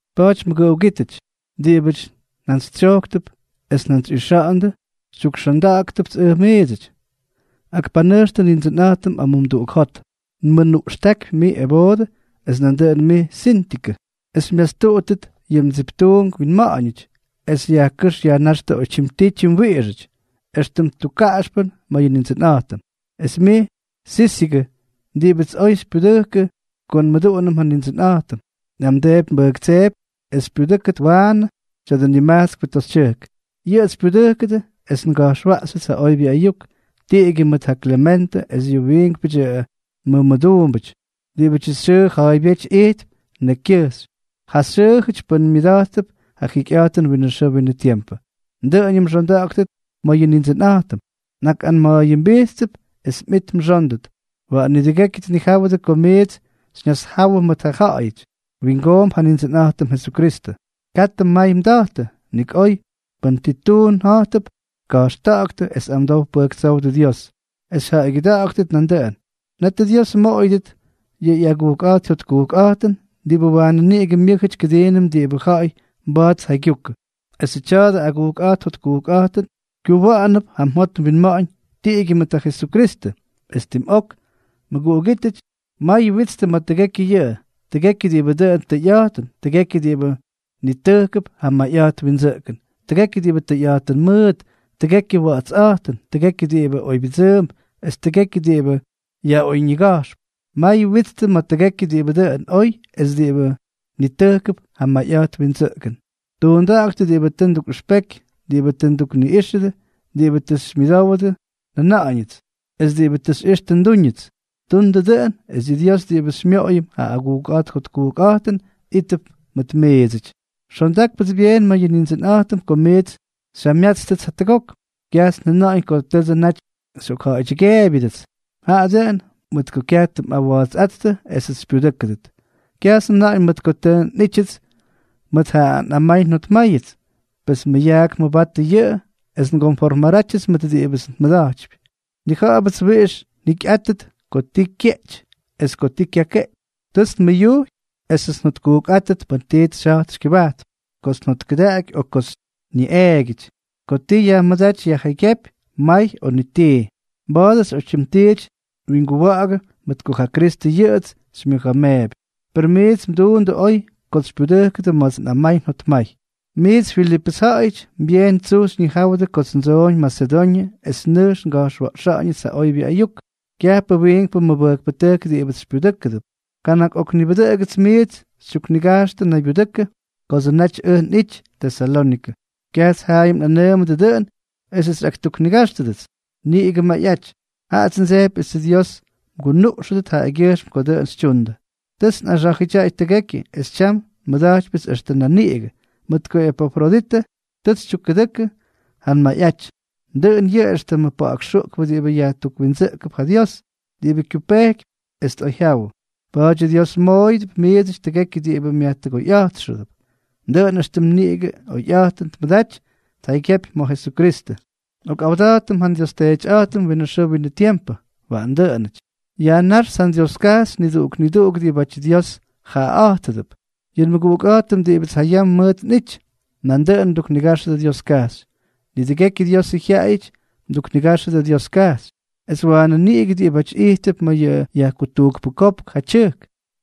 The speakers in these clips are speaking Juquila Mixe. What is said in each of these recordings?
Pa̱a̱ty mʉguꞌugítʉty, diꞌibʉty njantsytsyojktʉp es njantsyꞌixa̱ꞌa̱ndʉ, xytyukxondáktʉpts ʉj miidsʉty. Akpanʉjxtʉ Nindsʉnꞌa̱jtʉm amumduꞌuk jot. Nmʉnuꞌxtákypy mij Evoodʉ, es nandʉꞌʉn mij Síntikʉ, es xymyastuꞌuttʉt yʉ mdsip tuunk winma̱ꞌa̱ñʉty, es yajkʉ́x yajnáxtʉ oytyim tii tyimwiꞌixʉty, éxtʉm tukkaꞌaxpʉn ma̱ yʉ Nindsʉnꞌa̱jtʉm. Es mij Sísigʉ, diꞌibʉts oy xypyudʉjkʉ ko nmʉduꞌunʉm ja Nindsʉnꞌa̱jtʉm, nꞌamdeepy nbʉjktseepy es xypyudʉ́kʉt waanʉ tya̱dʉ nimajtskpʉ toxytyʉjk. Yʉꞌʉts xypyudʉjkʉdʉ es nga̱jxwaꞌxyʉts ja oybyʉ ayuk, tiꞌigyʉ mʉt ja Klementʉ es yʉ wiinkpʉdyʉ nmʉmʉduumbʉty diꞌibʉdyʉ xyʉʉ ja̱a̱ybyéty ijtp nekykyʉjxy, ja xyʉʉjʉty pʉ́nʉty myʉda̱jttʉp ja jikyꞌa̱jtʉn winʉ xʉʉ winʉ tiempʉ. Dʉꞌʉñʉm mxonda̱ꞌa̱ktʉt ma̱ yʉ Nindsʉnꞌa̱jtʉm. Nꞌakꞌanma̱a̱yʉmbijttʉp es mꞌit mxóndʉt. Waꞌan nidʉgekyʉ tnijáwʉdʉ ko miits xyñasjáwʉdʉ mʉt ja ja̱ꞌa̱yʉty. Wingoomp ja Nindsʉnꞌa̱jtʉm Jesukristʉ. Katʉ mmay mda̱jtʉ, nik oy, pʉn ti tuun ja̱jtʉp, ka̱jxta̱ꞌa̱ktʉ es amdow pʉjktsówdʉ Dios, es xyjaꞌaygyʉda̱ꞌa̱ktʉt nandʉꞌʉn. Netʉ Dios mmoꞌoyʉdʉt yʉ ꞌyagujkꞌa̱jt jyotkujkꞌa̱jtʉn, diꞌibʉ waanʉ niꞌigʉ myʉ́jʉty kʉdiinʉm diꞌibʉ ja̱ꞌa̱y mba̱a̱t tjaygyukʉ. Esʉ tya̱dʉ agujkꞌa̱jt jotkujkꞌa̱jtʉn kyuwa̱ꞌa̱nʉp ja mjot mwinma̱ꞌa̱ñ tiꞌigyʉ mʉt ja Jesukristʉ. Es tim ok, mʉguꞌugítʉty, may witstʉ ma̱ tʉgekyʉ yʉꞌʉ: tʉgekyʉ diꞌibʉ dʉn tʉyꞌa̱jtʉn, tʉgekyʉ diꞌibʉ nitʉjkʉp ja mayꞌa̱jt windsʉꞌkʉn, tʉgekyʉ diꞌibʉ tʉyꞌa̱jtʉn mʉʉt, tʉgekyʉ wa̱ꞌa̱tsꞌa̱jtʉn, tʉgekyʉ diꞌibʉ oybyʉdsʉʉmp, es tʉgekyʉ diꞌibʉ yaꞌoyñiga̱jxp. May witstʉ ma̱ tʉgekyʉ diꞌibʉ dʉn oy es diꞌibʉ nitʉjkʉp ja mayꞌa̱jt windsʉꞌkʉn. Tuunda̱ꞌa̱ktʉ diꞌibʉ tʉ ndukꞌʉxpeky, diꞌibʉ tʉ ndukniꞌíxʉdʉ, diꞌibʉ tʉ xymyʉdowdʉ njʉna̱ꞌa̱ñʉts, es diꞌibʉ tʉ xyꞌixtʉ ndúñʉts. Tundʉ dʉꞌʉn, es yʉ Dios diꞌibʉ xymyoꞌoyʉm ja agujkꞌa̱jt jotkujkꞌa̱jtʉn, ítʉp mʉt miidsʉty. Xondákpʉts byeen ma̱ yʉ Nindsʉnꞌa̱jtʉm ko miits xyjamyátstʉts jatʉgok. Kyajts njʉna̱ꞌa̱ñ ko tʉdsʉ naty xyꞌokja̱ꞌa̱ydyʉgeebyʉdʉts, jaꞌa dʉꞌʉn mʉt ko kyaj tʉ mꞌawa̱a̱dsʉꞌáttʉ esʉts xypyudʉ́kʉdʉt. Kyajts njʉna̱ꞌa̱ñ mʉt ko tʉ nꞌítyʉts mʉt ja nꞌamay njotmáyʉts, pes mʉyaak mʉbatʉ yʉꞌʉ es ngonformarátyʉts mʉt diꞌibʉts nmʉda̱jtypy. Nnija̱ꞌa̱bʉts wiꞌix njikyꞌátʉt ko ti kyeꞌty es ko ti kyakeꞌty. Tʉts nmʉyujy esʉts njotkujkꞌátʉt pʉn tits xyja̱jtp xykyʉbajtp, kots njotkʉdaꞌaky o kots nyuꞌeegyʉ, ko ti yajmʉdáty yajjaygyépy may o ni tii. Mba̱a̱dʉts oytyim tiity nwinguwa̱ꞌa̱gʉ, mʉt ko ja Kristʉ yʉꞌʉts xymyʉja̱a̱meepy. Per miits mduundʉ oy kots xypyudʉjkʉdʉ ma̱ts nꞌamay njotmay. Miits Filipʉs ja̱ꞌa̱yʉty, byeen tsuj xyñijáwʉdʉ kots ndsoꞌoñ Masedoñʉ es nʉjx nga̱jxwa̱ꞌxa̱ꞌa̱ñʉts ja oybyʉ ayuk, kyajpʉ wiinkpʉ mʉbʉjkpʉtʉjk diꞌibʉts xypyudʉjkʉdʉts. Kana̱k ok nibʉdʉꞌʉgʉts miits xytyuknigajxtʉ naybyudʉkʉ kodsʉ naty ʉj nꞌity Tesalónikʉ. Kyajts jayam nꞌanʉʉmʉdʉ dʉꞌʉn esʉts xyꞌaktuknigáxtʉdʉts niꞌigʉ mayꞌaty, jaꞌats ndsejpy esʉ Dios mgunuꞌxʉdʉt jaꞌagyʉjxm ko dʉꞌʉn xytyuundʉ. Tʉts nꞌaxá̱jʉdyaꞌay tʉgekyʉ, es tyam nmʉda̱jtypyʉts extʉ nan niꞌigʉ, mʉt ko Epafroditʉ tʉts xytyukkʉdʉkʉ ja mmayꞌaty. Dʉꞌʉn yʉꞌʉ éxtʉmʉ pa̱ꞌa̱k xuꞌkpʉ diꞌibʉ yajtukwindsʉꞌkʉp ja Dios, diꞌibʉ kyupejkypy es tꞌoyjyawʉ. Pa̱a̱dyʉ Dios mmoꞌoyʉdʉp miidsʉty tʉgekyʉ diꞌibʉ myajtʉgoyꞌa̱jttʉp, dʉꞌʉn éxtʉm niꞌigʉ oyꞌa̱jtʉn tmʉdaty tjaygyepy ma̱ Jesukristʉ. Nꞌokꞌawda̱jtʉm ja nDios Teetyꞌa̱jtʉm winʉ xʉʉ winʉ tiempʉ. Waꞌan dʉꞌʉnʉty. Yajnáxts ja nDioskajxy niduꞌuk niduꞌuk diꞌibáty Dios jaꞌaꞌa̱jtʉdʉp. Yʉ nmʉguꞌukꞌa̱jtʉm diꞌibʉts jayam mʉʉt nꞌity, nandʉꞌʉn mduknigáxʉdʉ Dioskajxy. Nidʉgekyʉ Diosʉ jyaꞌayʉty mduknigáxʉdʉ Dioskajxy, es waanʉ niꞌigʉ diꞌibáty ijttʉp ma̱ yʉ yajkutujkpʉ kopk ja tyʉjk,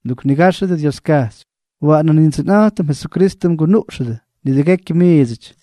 mduknigáxʉdʉ Dioskajxy. Waꞌanʉ Nindsʉnꞌa̱jtʉm Jesukristʉ mgunuꞌxʉdʉ nidʉgekyʉ miidsʉty.